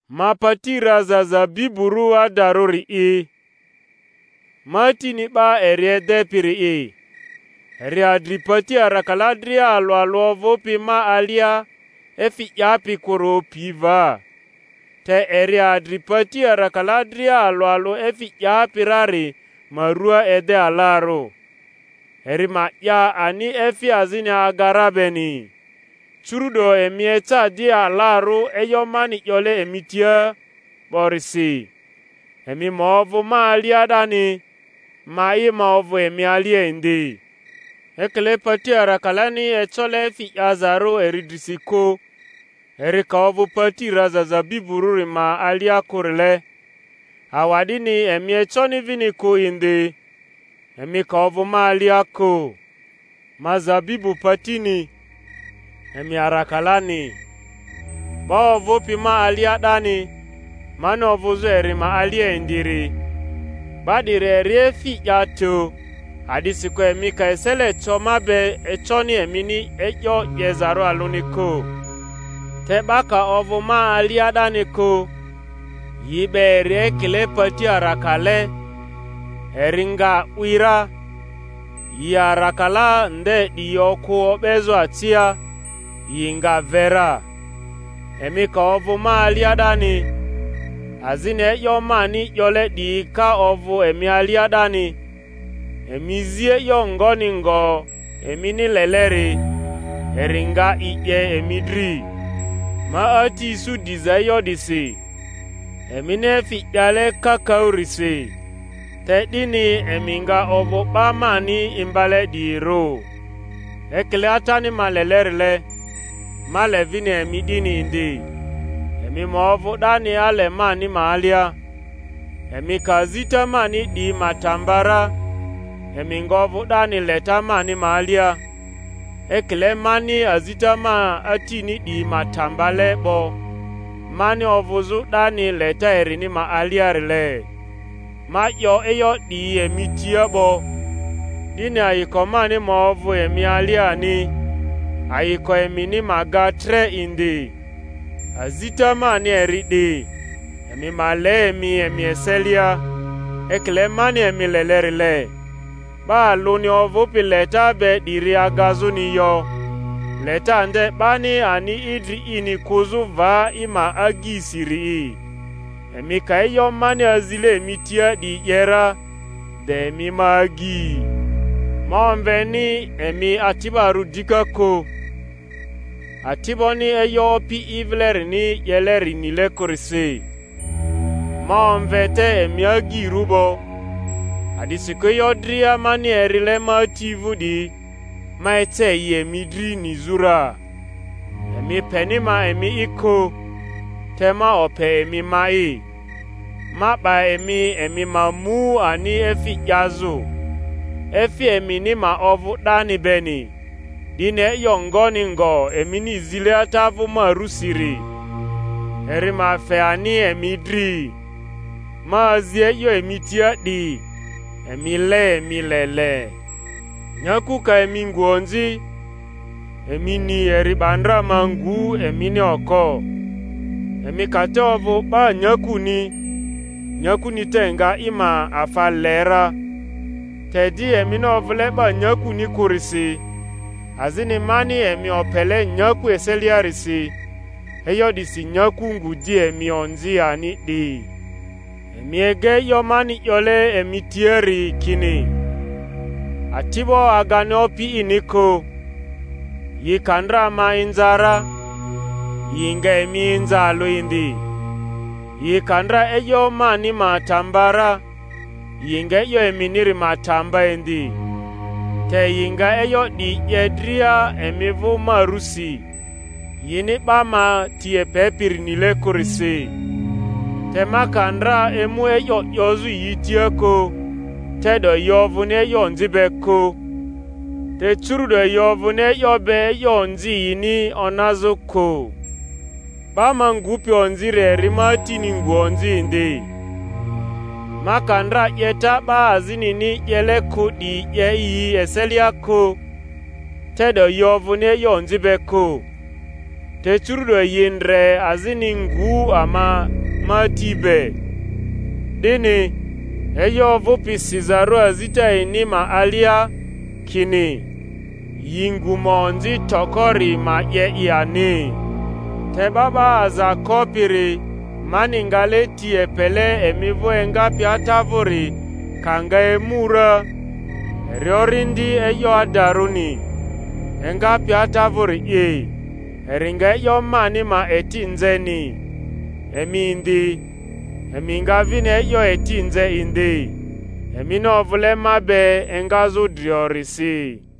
Ma pati raza zabiburᴜ adarᴜri'i, ma Atini 'ba eri edepiri'i. Eri adri pati arakala dria alᴜ alᴜ ovᴜpi ma alia efi 'yapi kᴜri opi va; te eri adri pati arakala dria alᴜ alᴜ efi 'yapi rari ma rua ede alarᴜ, eri ma 'ya ani efi azini aga ra beni. Curu’do emi eca di alarᴜ e'yo mani 'yole emi tia 'borisi. Emi ma ovᴜ ma alia 'dani, ma'i ma ovᴜ emi alia indi. Ekile pati arakalani ecole efi 'yazarᴜ eri drisi kᴜ, eri ka ovᴜ pati raza zabiburᴜri ma alia kᴜrile, awa'dini emi econi vini kᴜ indi, emi ka ovᴜ ma alia kᴜ. Ma zabibu patini, emi arakalani. 'Ba ovᴜpi ma alia 'dani, mani ovᴜzᴜ eri ma alia indiri, 'ba 'diri eri efi 'ya tᴜ, a'disikᴜ emi ka esele co ma be econi emini e'yo 'yezarᴜ alᴜni kᴜ. Te 'ba ka ovᴜ ma alia 'dani kᴜ, yi 'be eri ekile pati arakale, eri nga 'wi ra; yi arakala nde 'diyi okᴜ o'bezᴜ acia, yi nga ve ra. Emi ka ovᴜ ma alia 'dani, azini e'yo mani 'yole 'diyi ka ovᴜ emi alia 'dani, emi zi e'yo ngoni ngo emini leleri, eri nga i 'ye emi dri. Ma Ati isu diza e'yo 'disi, emini efi 'yale kakaᴜrisi; te 'dini emi nga ovᴜ 'ba mani imbale 'diyirᴜ. Ekile Atani ma lelerile, ma le vini emi 'dini indi; emi ma ovᴜ 'dani ale mani ma alia. Emi ka azita mani 'diyi ma ta mba ra, emi nga ovᴜ 'dani leta mani ma alia; ekile mani azita ma Atini 'diyi ma ta mbale 'bo, mani ovᴜzᴜ 'dani leta erini ma aliarile. Ma 'yo e'yo 'diyi emi tia 'bo, 'dini ayiko mani ma ovᴜ emi alia ani, ayiko emini ma ga tre indi. Azita mani eri 'di, emi ma le emi emi eselia, ekile mani emi lelerile. 'Ba alᴜni ovᴜpi leta be 'diri agazᴜni yo, leta nde 'bani ani idri ini kᴜzᴜ va i ma agyisiri'i. Emi ka e'yo mani azile emi tia 'diyi 'ye ra, de emi ma agyi. Ma omveni emi ati'barᴜ dika kᴜ, ati'boni e'yo opi i vilerini 'yeleri nile kᴜrisi; ma omve te emi agyirᴜ 'bo, a'disikᴜ e'yo dria mani erile ma Ati vᴜ 'diyi, ma ece yi emi dri nizᴜ ra. Emi peni ma emi'i kᴜ, te ma ope emi ma'i, ma 'ba emi emi ma mu ani efi 'yazᴜ, efi emini ma ovᴜ 'dani beni; 'dini e'yo ngoni ngo emini zile Ata vᴜ ma rᴜsiri, eri ma fe ani emi dri. Ma azi e'yo emi tia 'di, emi le emi le le. Nyaku ka emi ngu onzi, emi ni eri 'ba ndra ma ngu emini oko. Emi ka te ovᴜ 'ba nyakuni, nyakuni te nga i ma afa le ra; te di emini ovᴜle 'ba nyakuni kᴜrisi, azini mani emi opele nyaku eseliarisi, e'yo 'disi nyaku ngu di emi onzi ani 'di. Emi ega e'yo mani 'yole emi tiari kini, Ati'bo agani opi ini kᴜ. Yi ka ndra ma inza ra, yi nga emi inza alᴜ indi; yi ka ndra e'yo mani ma ta mba ra, yi nga e'yo eminiri ma ta mba indi. Te yi nga e'yo 'diyi 'ye dria emi vᴜ ma rusi, yini 'ba ma ti epepiri nile kᴜrisi. Te ma ka ndra emu e'yo 'yozᴜ yi tia kᴜ, te'do yi ovᴜni e'yo onzi be kᴜ; te curu'do yi ovᴜni e'yo be e'yo onzi yini onazᴜ kᴜ. 'Ba ma ngupi onziri eri ma Atini ngᴜ onzi indi. Ma ka ndra 'yeta 'ba azinini 'yele kᴜ 'diyi 'ye yi eselia kᴜ, te'do yi ovᴜni e'yo onzi be kᴜ; te curu’do yi ndre azini ngᴜ ama ma Ati be. 'Dini, e'yo ovᴜpi sizarᴜ azita yini ma alia kini, Yi ngu ma onzi toko-ri ma 'ye i ani. Te 'Ba 'ba Aza Kopiri mani ngale ti epele emi vᴜ engapi Ata vᴜri ka nga emu ra, eri Orindi e'yo adarᴜni, engapi Ata vᴜri'i, eri nga e'yo mani ma eti nzeni; emi indi, emi nga vini e'yo eti nze indi, emini ovule ma be engazᴜ driorisi.